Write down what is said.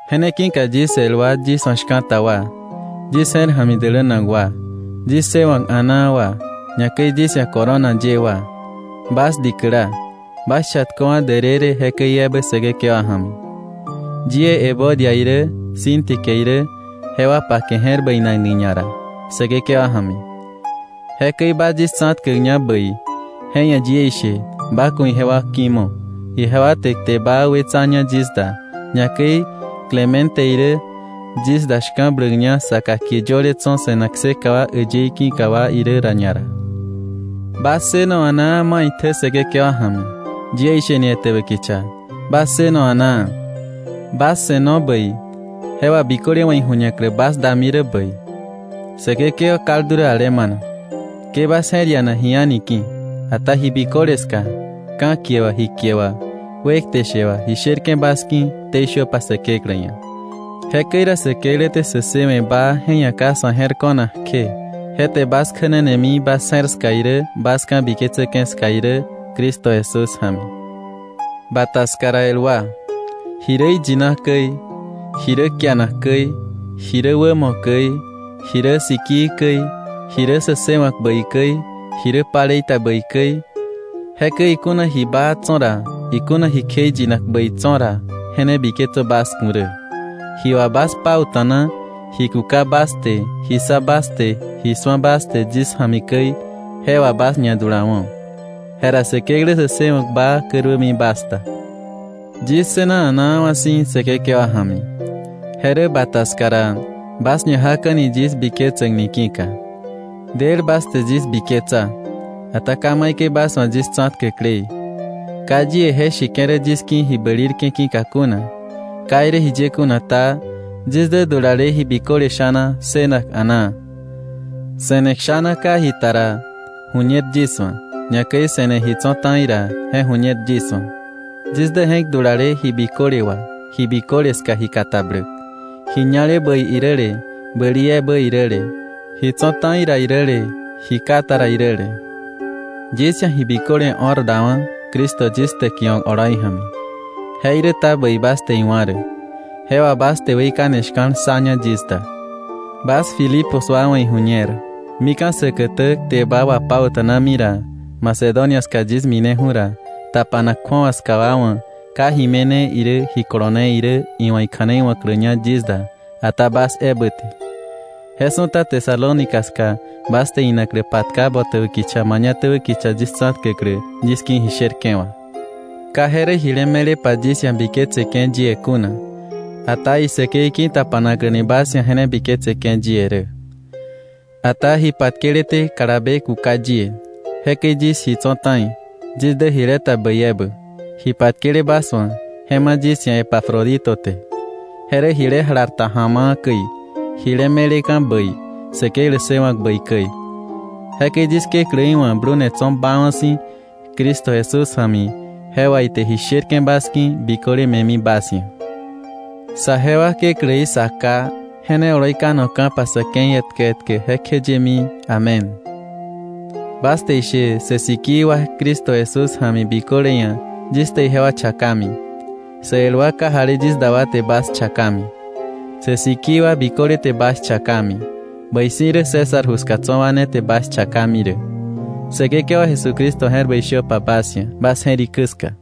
Je ne ki̱ka yis el wa yis wa̱ shka̱ta wa, yis je̱r ja̱mi dälänak wa, yis ssëwa̱k a̱naa wa, ñakäi yis ia̱ corona ye wa, bas dikäla, bas chatköwa̱ därërë jekäi ebä Säkekewa ja̱mi. Yie Evodia irä, Síntique irä, jewa pake je̱r bäinakni ñara Säkekewa ja̱mi. Jekäi ba yis tsa̱tkäkña bäi, je ia̱ yie ishe ba ku̱ ijewa ki̱mo̱. Ijewa te kte baa wetsaña yis da, ñakäi Clemente irä yis da shka̱bläkña saka kie yöle tso̱ se̱nak kseka wa äyëí ki̱ wa irä ra ñara. Bas ssëno a̱naa maitjä Säkekewa ja̱mi. Yie isheni etäbä kicha, bas ssëno a̱naa. Bas se̱no bäi, je wà biköle wa̱ ijuñaklä bas dami rä bäi. Säkekewa kaldu rä alemana. Ke bas je̱r iana ji a̱ni ki̱, ata ji biköle ska, ka̱kie wà, ji kie wà, wekte she wà, ji sherke̱ bas ki̱ ktei shöpa Säkeklä ia̱. Jekäi ra Säkeklä te sä ssëwe̱ baa je ia̱ ka sa̱ je̱r ko̱nak kje, je te bas kjänanemi bas je̱r ska irä bas ka̱biketsäke̱ ska irä Cristo Jesús ja̱mi. Bata ska ra, el wa, ji rä iyina käi, ji rä kianak käi, ji rä wämo käi, ji rä sikii käi, ji rä sä ssëwa̱k bäi käi, ji rä palei ta bäi käi, jekäi ikuna ji baa tso̱ ra, ikuna ji kjeiyinak bäi tso̱ ra, je ne biketsö bas ku̱ rä. Ji wà bas pauta̱na, ji kuka bas te, ji ssa bas te, ji su̱a bas te yis ja̱mi käi, je wà bas ñadulawo̱. Jera Säkeklä sä ssëwa̱k baa käruämi bas da. Yis ssëna a̱naawa̱ si̱ Säkekewa ja̱mi. Je rä bata ska ra, bas ñajaka̱ni yis biketsäkni ki̱ka. Del bas te yis biketsa, ata ka maikäi bas wa̱ yis tsa̱tkäkleí. Ka yie je sheke̱ rä yis ki̱ ji bälirke̱ ki̱ka kuna. Ka irä jiye kuna ta, yis dä dulale ji biköle sha̱na ssënak a̱naa. Se̱ne kshana ka ji ta ra ju̱ñer yis wa̱, ñakäi se̱ne ji tso̱ ta̱i ra je ju̱ñer yis wa̱. Yis dä je̱k dulale ji biköle wà ji biköle ska ji katabläk, ji ñale bäi iräle bäli ebä iräle, ji tso̱ ta̱i ra iräle ji ka ta ra iräle. Yis ia̱ ji biköle o̱r dawa̱ Cristo yis täkiwa̱k oloi ja̱mi. Jeiräta bäi bas te iwa̱ rä, je wà bas te weikane shka̱l ssaña yis da. Bas Filipos wa wa̱ iju̱ñer, mika̱ säkätä kte baa wapauta̱nami ra, Macedonia ska yis mineju̱ ra, tapanak kju̱awa ska wa wa̱ ka ji me̱ne irä ji kolone irä iwa̱ ikja̱nei wa̱kläña yis da, ata bas ebä te. Je su̱ta Tesalónica ska bas te inaklä patka botäbä kicha mañatäbä kicha yis tsa̱tkäklä yis ki̱ ji sherke̱ wà. Ka je rä jile me̱lepa yis ia̱ biketseke̱ yie kuna, ata isäkei ki̱tapanaklä bas ia̱ je ne biketseke̱ yie rä. Ata ji patkeleté kalabe kuka yie, jekäi yis ji tso̱ ta̱i. Yis dä jileta bäi ebä, ji patkele bas wa̱ je ma̱ yis ia̱ Epafrodito te. Je rä jile jalarta ja̱ma̱a̱ käi, jile me̱leka̱ bäi, Säkeklä ssëwa̱k bäi käi. Jekäi yis Kekläí wa̱ blune tso̱ baawa̱ si̱ Cristo Jesús ja̱mi, je wà ite ji sherke̱ bas ki̱ biköle me̱mi bas ia̱. ¡Saje wa Kekläí, Sa Ká, je ne oloi kanoka̱pa sa̱ ke̱i etkä etkä jekjeyemi! Amén. Bas te ishe sä sikii wa Cristo Jesús ja̱mi biköle ia̱ yis te ijewa chakami. Sä el wa kajali yis da wa te bas chakami. Sä sikii wa biköle te bas chakami. Bäi si̱ rä César ju ska tso̱ wa ne te bas chakami rä. Säkekewa Jesucristo je̱r bäi shöpa bas ia̱ bas je̱rikä ska.